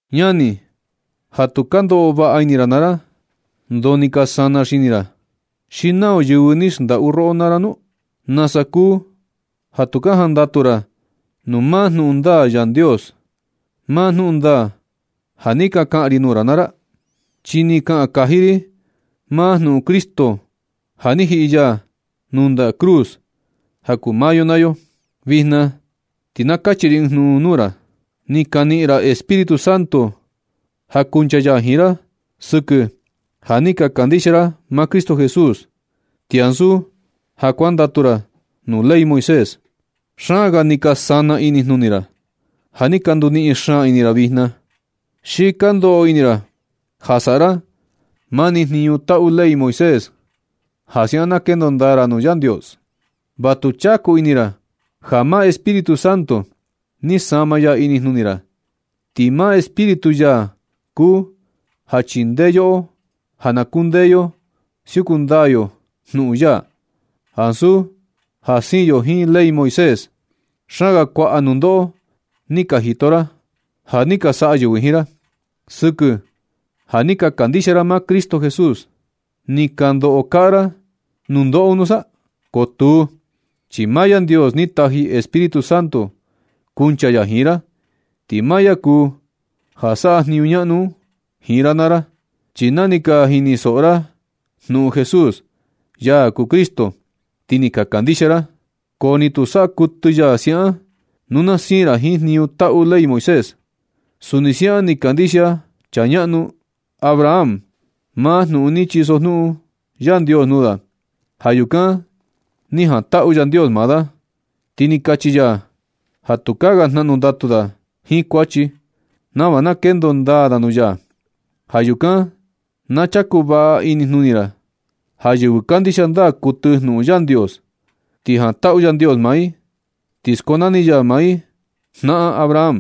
Ñani ja tu ka ndoꞌo vaꞌa ini ra naa ra, ¿ndoo ni ka sana xini ra? ¿Xi nau yɨvɨ ni xndaꞌu roꞌo naa ra nu? ¿Nasa kuu ja tu ka jandatu ra nuu maa jnuꞌun ndaa Yandios, maa jnuꞌun ndaa ja ni ka kaꞌan ri nuu ra naa ra? Chi ni kaꞌan kaji ri maa jnuꞌun Cristo ja ni jiꞌi ya nuu ndaꞌa cruz ja kuu maa yo naa yo. Vijna ti na kachi ri ɨɨn jnuꞌun nuu ra. Ni ka niꞌin ra Espíritu Santo ja kuncha ya jiin ra sɨkɨ ja ni ka kandixia ra maa Cristo Jesús, ti ansu ja kuandatu ra nuu ley Moisés. Xaan ga ni ka sana inijnuni ra ja ni ka nduniꞌin xaan ini ra vijna. ¿Xi ka ndoꞌo ini ra ja saꞌa ra mani jniñu ja taꞌu ley Moisés, ja siaꞌan na kendo ndaa ra nuu Yandios? Va tu chaku ini ra ja maa Espíritu Santo ni sama ya inijnuni ra, ti maa Espíritu ya kuu ja chindee yoꞌo ja na kundee yo siuku ndaa yo jnuꞌun ya, ansu ja siin yo jiin ley Moisés. Xaan ga kuaꞌa nundoꞌo ni ka jito ra ja ni ka saꞌa yɨvɨ jiin ra, sɨkɨ ja ni ka kandixia ra maa Cristo Jesús. ¿Ni ka ndoꞌo kaꞌa ra nundoꞌo un nusa? Ko tuu, chi maa Yandios ni taji Espíritu Santo kuncha ya jiin ra. Ti maa ya kuu ja saꞌa jniñu ñaꞌnu un jiin ra naa ra. Chi na ni ka jinisoꞌo ra jnuꞌun Jesús, ya kuu Cristo, ti ni ka kandixia ra. Ko ni tu saꞌa kuɨtɨ ya siaꞌan nu na siin ra jiin jniñu taꞌu ley Moisés. Suni siaꞌan ni kandixia chaa ñaꞌnu Abraham maa jnuꞌun ni chisojnuꞌun Yandios nuu da. Ja yukan ni jantaꞌu Yandios maa da, ti ni kachi ya ja tukaa ga jnaꞌnu ndatu da jiin kuachi, nava na kendo ndaa da nuu ya. Ja yukan na chaku vaꞌa inijnuni ra ja yɨvɨ kandixia ndaa kuɨtɨ jnuꞌun Yandios, ti jantaꞌu Yandios maa i ti skonani ya maa i jnaꞌan Abraham.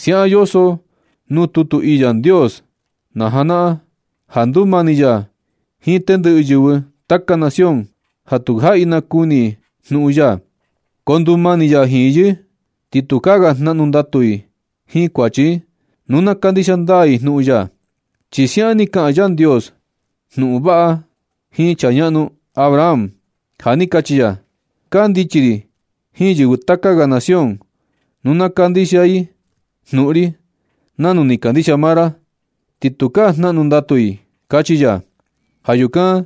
Siaꞌan yoso nuu tutu ii Yandios najanaꞌan, ja ndumani ya jiin tendɨꞌɨ yɨvɨ taka nación ja tu jaꞌi nakuni i jnuꞌun ya, ko ndumani ya jiin yɨ, ti tukaa ga jnaꞌnu ndatu i jiin kuachi i nu na kandixia ndaa i jnuꞌun ya. Chi siaꞌan ni kaꞌan Yandios jnuꞌun vaꞌa un jiin chaa ñaꞌnu Abraham ja ni kachi ya: “Kandichi ri jiin yɨvɨ taka ga nación nu na kandixia i jnuꞌun ri nanu ni kandixia maa ra ti tukaa jnaꞌnu ndatu i”, kachi ya. Ja yukan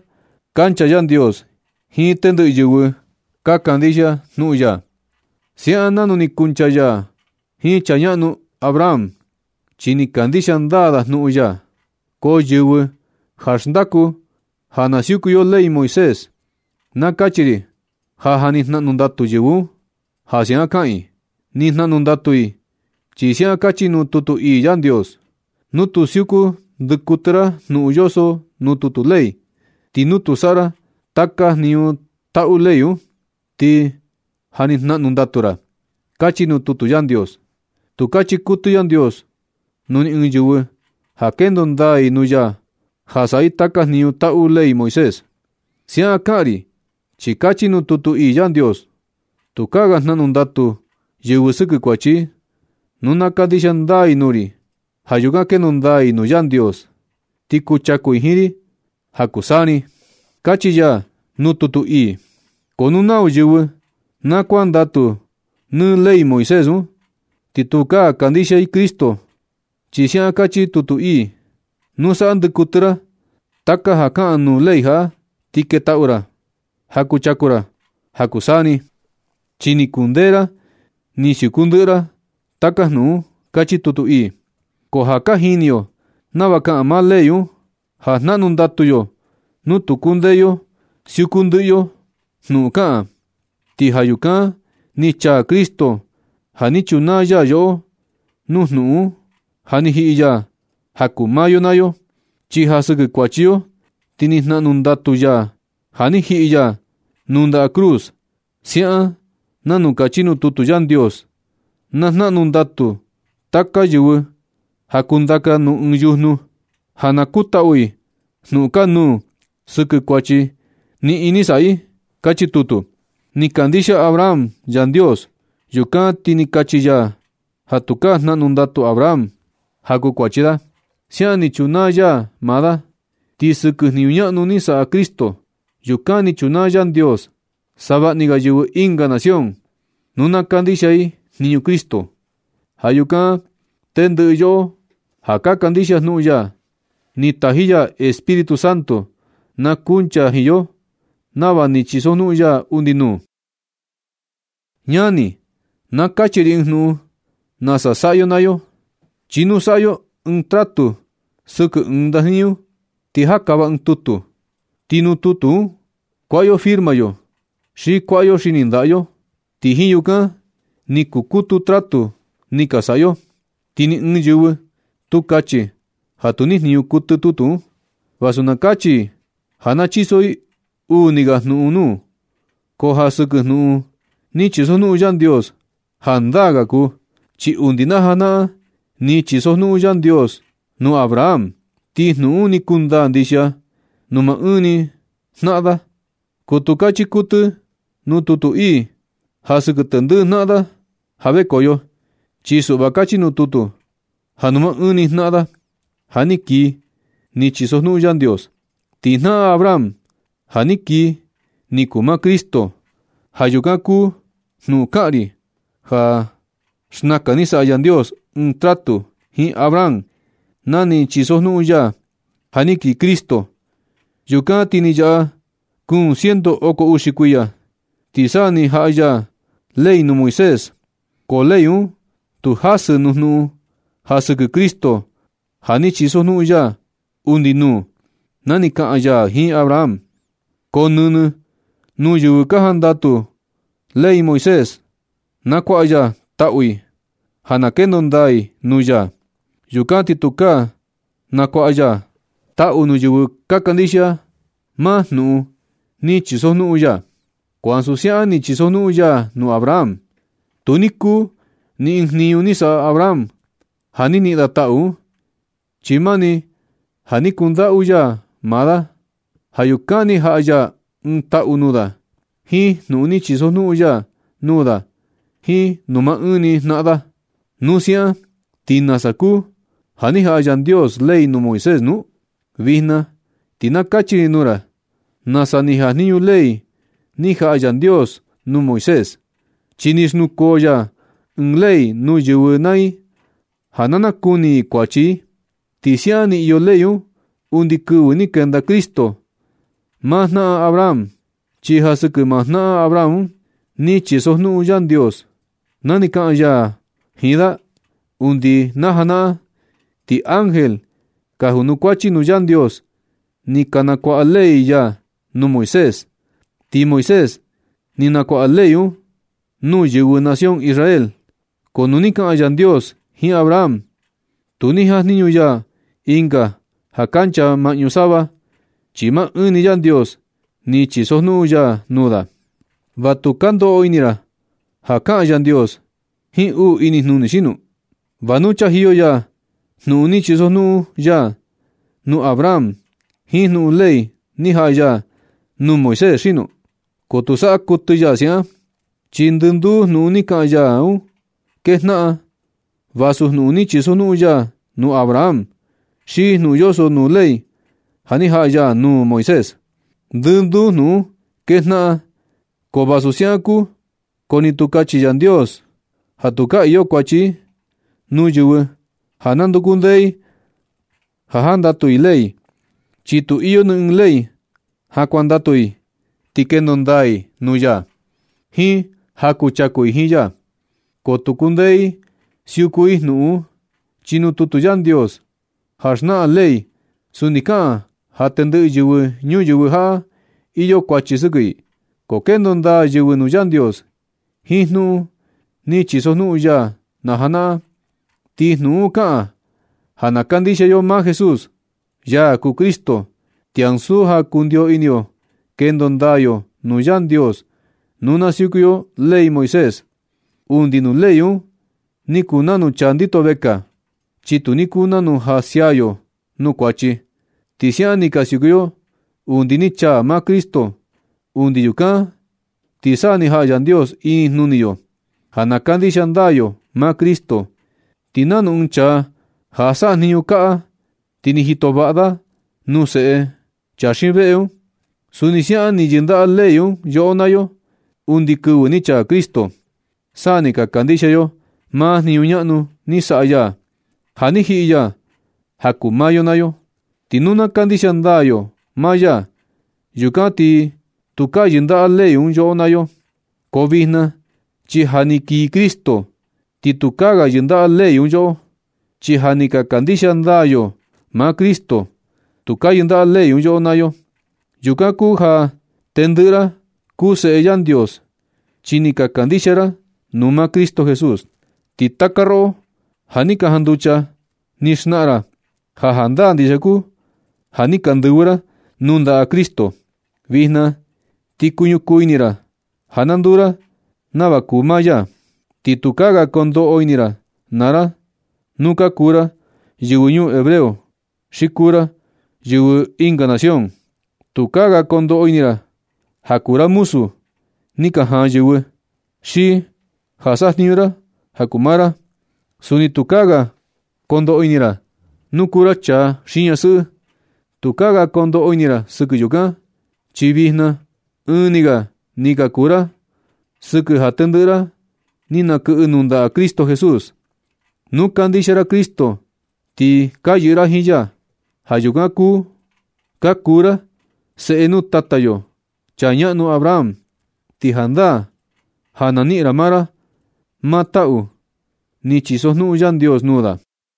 kancha Yandios jiin tendɨꞌɨ yɨvɨ ka kandixia jnuꞌun ya, siaꞌan nanu ni kuncha ya jiin chaa ñaꞌnu Abraham, chi ni kandixia ndaa da jnuꞌun ya. Ko yɨvɨ ja xndaku ja na siuku yo ley Moisés, na kachi ri ja ja ni jnaꞌnu ndatu yɨvɨ un, ja siaꞌan kaꞌan i. Ni jnaꞌnu ndatu i chi siaꞌan kachi nuu tutu ii Yandios: “Nu tu siuku ndɨ kuɨtɨ ra jnuꞌun yoso nuu tutu ley, ti nu tu saꞌa ra taka jniñu taꞌu ley un, ti na jnaꞌnu ndatu ra”, kachi nuu tutu Yandios. Tu kachi kuɨtɨ Yandios nuu ni ɨɨn yɨvɨ ja kendo ndaa i nuu ya ja saꞌa i taka jniñu taꞌu ley Moisés. Siaꞌan kaꞌan ri chi kachi nuu tutu ii Yandios: “Tukaa ga jnaꞌnu ndatu yɨvɨ sɨkɨ kuachi i nu na kandixia ndaa i nuu ri. Ja yukan kendo ndaa i nuu Yandios ti kuchaku i jiin ri ja kuu taka saa ni”, kachi ya nuu tutu ii. Ko nu nau yɨvɨ na kuandatu nɨ ley Moisés un, ti tukaa kandixia i Cristo, chi siaꞌan kachi tutu ii: “Nu saꞌa ndɨ kuɨtɨ ra taka ja kaꞌan nuu ley jaꞌa, ti ketaꞌu ra ja kuchaku ra ja kuu taka saa ni, chi ni kundee ra ni siuku ndɨꞌɨ ra taka jnuꞌun un”, kachi tutu ii. Ko ja ka jini yo nava kaꞌan maa ley un ja jnaꞌnu ndatu yo nu tu kundee yo siuku ndɨꞌɨ yo jnuꞌun kaꞌan. Ti ja yukan ni chaa Cristo ja ni chunaa ya yoꞌo nuu jnuꞌun un, ja ni jiꞌi ya ja kuu maa yo naa yo. Chi ja sɨkɨ kuachi yo ti ni jnaꞌnu ndatu ya ja ni jiꞌi ya nuu ndaꞌa cruz siaꞌan nanu kachi nuu tutu Yandios: “Na jnaꞌnu ndatu taka yɨvɨ ja kundaka nuu ɨɨn yujnu, ja na kutaꞌu i jnuꞌun kanuu sɨkɨ kuachi niꞌin ni saꞌa i”, kachi tutu. Ni kandixia Abraham Yandios. Yukan ti kachi ya ja tukaa jnaꞌnu ndatu Abraham ja kuu kuachi da. Siaꞌan ni chunaa ya maa da. Ti sɨkɨ jniñu ñaꞌnu ni saꞌa Cristo, yukan ni chunaa Yandios savaꞌni ga yɨvɨ ɨnga nación nu na kandixia i jniñu Cristo. Ja yukan tendɨꞌɨ yoꞌo ja ka kandixia jnuꞌun ya, ni taji ya Espíritu Santo na kuncha jiin yo nava ni chisojnuꞌun ya undi nuu. Ñani, na kachi ri ɨɨn jnuꞌun nasa saꞌa yo naa yo, chi nu saꞌa yo ɨɨn tratu sɨkɨ ɨɨn ndajniñu ti jakava ɨɨn tutu. Ti nuu tutu un kuaꞌa yo firma yo xi kuaꞌa yo xini ndaꞌa yo, ti jiin yukan ni kukutu tratu ni ka saꞌa yo. Ti ni ɨɨn yɨvɨ, tu kachi ja tu nijniñu kuɨtɨ tutu un, vasu na kachi i ja na chiso i uu uni ga jnuꞌun nuu. Ko ja sɨkɨ jnuꞌun ni chisojnuꞌun Yandios, jandaa ga kuu. Chi undi na janaꞌan ni chisojnuꞌun Yandios nuu Abraham. Ti jnuꞌun un ni kundaa ndixia nuu maa ɨɨn ni jnaꞌan da. Ko tu kachi kuɨtɨ nuu tutu ii ja sɨkɨ tendɨꞌɨ jnaꞌan da ja vekoyo. Chi suꞌva kachi nuu tutu ja nuu maa ɨɨn ni jnaꞌan da ja kii ni chisojnuꞌun Yandios. Ti jnaꞌan Abraham ja kii ni kuu maa Cristo. Ja yukan kuu jnuꞌun kaꞌan ri ja xnakan ni saꞌa Yandios ɨɨn tratu jiin Abraham na ni chisojnuꞌun ya ja na kii Cristo. Yukan ti ni yaꞌa kuun ciento oko uxi kuiya, ti sa ni jaꞌa ya ley nuu Moisés. Ko ley un tu jasɨ nuu jnuꞌun ja sɨkɨ Cristo ja ni chisojnuꞌun ya undi nuu na ni kaꞌan ya jiin Abraham. Ko nɨnɨ nuu yɨvɨ ka jandatu ley Moisés na kuaꞌa ya taꞌu i ja na kendo ndaa i nuu ya, yukan ti tukaa na kuaꞌa ya taꞌu nuu yɨvɨ ja kandixia i maa jnuꞌun ni chisojnuꞌun ya. Ko ansu siaꞌan ni chisojnuꞌun ya nuu Abraham. Tu ni kuu ni ɨɨn jniñu ni saꞌa Abraham ja ni niꞌin da taꞌu un, chi mani ja ni kundaꞌu ini ya maa da. Ja yukan ni jaꞌa ya ɨɨn taꞌu nuu da jiin jnuꞌun ni chisojnuꞌun ya nuu da jiin nuu maa ɨɨn ni jnaꞌan da. Nu siaꞌan, ¿ti nasa kuu ja ni jaꞌa Yandios ley nuu Moisés nu? Vijna ti na kachi ri nuu ra nasa ni jajniñu ley ni jaꞌa Yandios nuu Moisés. Chi ni xnukoo ya ɨɨn ley nuu yɨvɨ naa i ja na nakuni i kuachi i. Ti siaꞌan ni iyo ley un undi kɨvɨ ni kenda Cristo, maa jnaꞌan Abraham. Chi ja sɨkɨ maa jnaꞌan Abraham un ni chisojnuꞌun Yandios na ni kaꞌan ya jiin da undi najanaꞌan. Ti ángel ka junukuachi nuu Yandios ni ka nakuaꞌa ley ya nuu Moisés, ti Moisés ni nakuaꞌa ley un nuu yɨvɨ nación Israel. Ko nu ni kaꞌan Yandios jiin Abraham tu ni jajniñu ya ɨnga ja kancha maꞌñu sava, chi maa ɨɨn ni Yandios ni chisojnuꞌun ya nuu da. ¿Va nu ka ndoꞌo ini ra ja kaꞌan Yandios jiin uu inijnuni xino? ¿Va nu chajiyo ya jnuꞌun ni chisojnuꞌun ya nuu Abraham jiin jnuꞌun ley ni jaꞌa ya nuu Moisés xino? ¡Ko tu saꞌa kuɨtɨ ya siaꞌan! Chi ndɨnduu jnuꞌun ni kaꞌan ya un kejnaꞌan, vasu jnuꞌun ni chisojnuꞌun ya nuu Abraham xi jnuꞌun yoso nuu ley ja ni jaꞌa ya nuu Moisés. Ndɨnduu jnuꞌun un kejnaꞌan. Ko vasu siaꞌan kuu, ko tu ni kachi Yandios ja tukaa iyo kuachi i nuu yɨvɨ ja nanduku ndee i ka jandatu i ley, chi tu iyo ni ɨɨn ley ja kuandatu i ti kendo ndaa i nuu ya, jiin ja kuchaku i jiin ya. Ko tu kundee i siuku i jnuꞌun un, chi nuu tutu Yandios ja xnaꞌan ley, suni kaꞌan ja tendɨꞌɨ yɨvɨ ñuyɨvɨ jaꞌa iyo kuachi sɨkɨ i. Ko kendo ndaa yɨvɨ nuu Yandios jiin jnuꞌun ni chisojnuꞌun ya najanaꞌan, ti jnuꞌun un kaꞌan ja na kandixia yo maa Jesús, ya kuu Cristo. Ti ansu ja kundio ini yo kendo ndaa yo nuu Yandios nu na siuku yo ley Moisés. Undi nuu ley un ni kuu nanu chaa ndito vekaa, chi tu ni kuu nanu ja sia yo nuu kuachi. Ti siaꞌan ni ka siuku yo undi ni chaa maa Cristo. Undi yukan ti sa ni jaꞌa Yandios inijnuni yo ja na kandixia ndaa yo maa Cristo. Ti nanu ɨɨn chaa ja sajniñu kaꞌa, ti ni jito vaꞌa da nuu seꞌe chaa xiin veꞌe un, suni siaꞌan ni yɨndaꞌa ley un yoꞌo naa yo undi kɨvɨ ni chaa Cristo, sa ni ka kandixia yo maa jniñu ñaꞌnu ni saꞌa ya ja ni jiꞌi ya ja kuu maa yo naa yo. Ti nu na kandixia ndaa yo maa ya, yukan ti tukaa yɨndaꞌa ley un yoꞌo naa yo. Ko vijna chi ja ni kii Cristo, ti tukaa ga yɨndaꞌa ley un yoꞌo, chi ja ni ka kandixia ndaa yo maa Cristo. Tukaa yɨndaꞌa ley un yoꞌo naa yo. Yukan kuu ja tendɨꞌɨ ra kuu Seꞌe Yandios, chi ni ka kandixia ra nuu maa Cristo Jesús. Ti taka roꞌo ja ja ni ka janducha ni xnaꞌan ra ja jandaa ndixia kuu ja ni ka ndɨvɨ ra nuu ndaꞌa Cristo. Vijna ti kuñukuu ini ra ja na nduu ra nava kuu maa ya. Ti tukaa ga kondoꞌo ini ra naa ra nu ka kuu ra yɨvɨ ñuu hebreo xi kuu ra yɨvɨ ɨnga nación. Tukaa ga kondoꞌo ini ra ja kuu ra muzu ni ka jaan yɨvɨ, xi ja sajniñu ra ja kuu maa ra. Suni tukaa ga kondoꞌo ini ra nu kuu ra chaa xi ñasɨꞌɨ. Tukaa ga kondoꞌo ini ra sɨkɨ yukan, chi vijna ɨɨn ni ga ni ka kuu ra sɨkɨ ja tendɨꞌɨ ra ni nakɨꞌɨ nuu ndaꞌa Cristo Jesús. Nu kandixia ra Cristo, ti ka yɨꞌɨ ra jiin ya. Ja yukan ka kuu ra seꞌe nuu tata yo chaa ñaꞌnu Abraham, ti jandaa ja na niꞌin ra naa ra maa taꞌu ni chisojnuꞌun Yandios nuu da.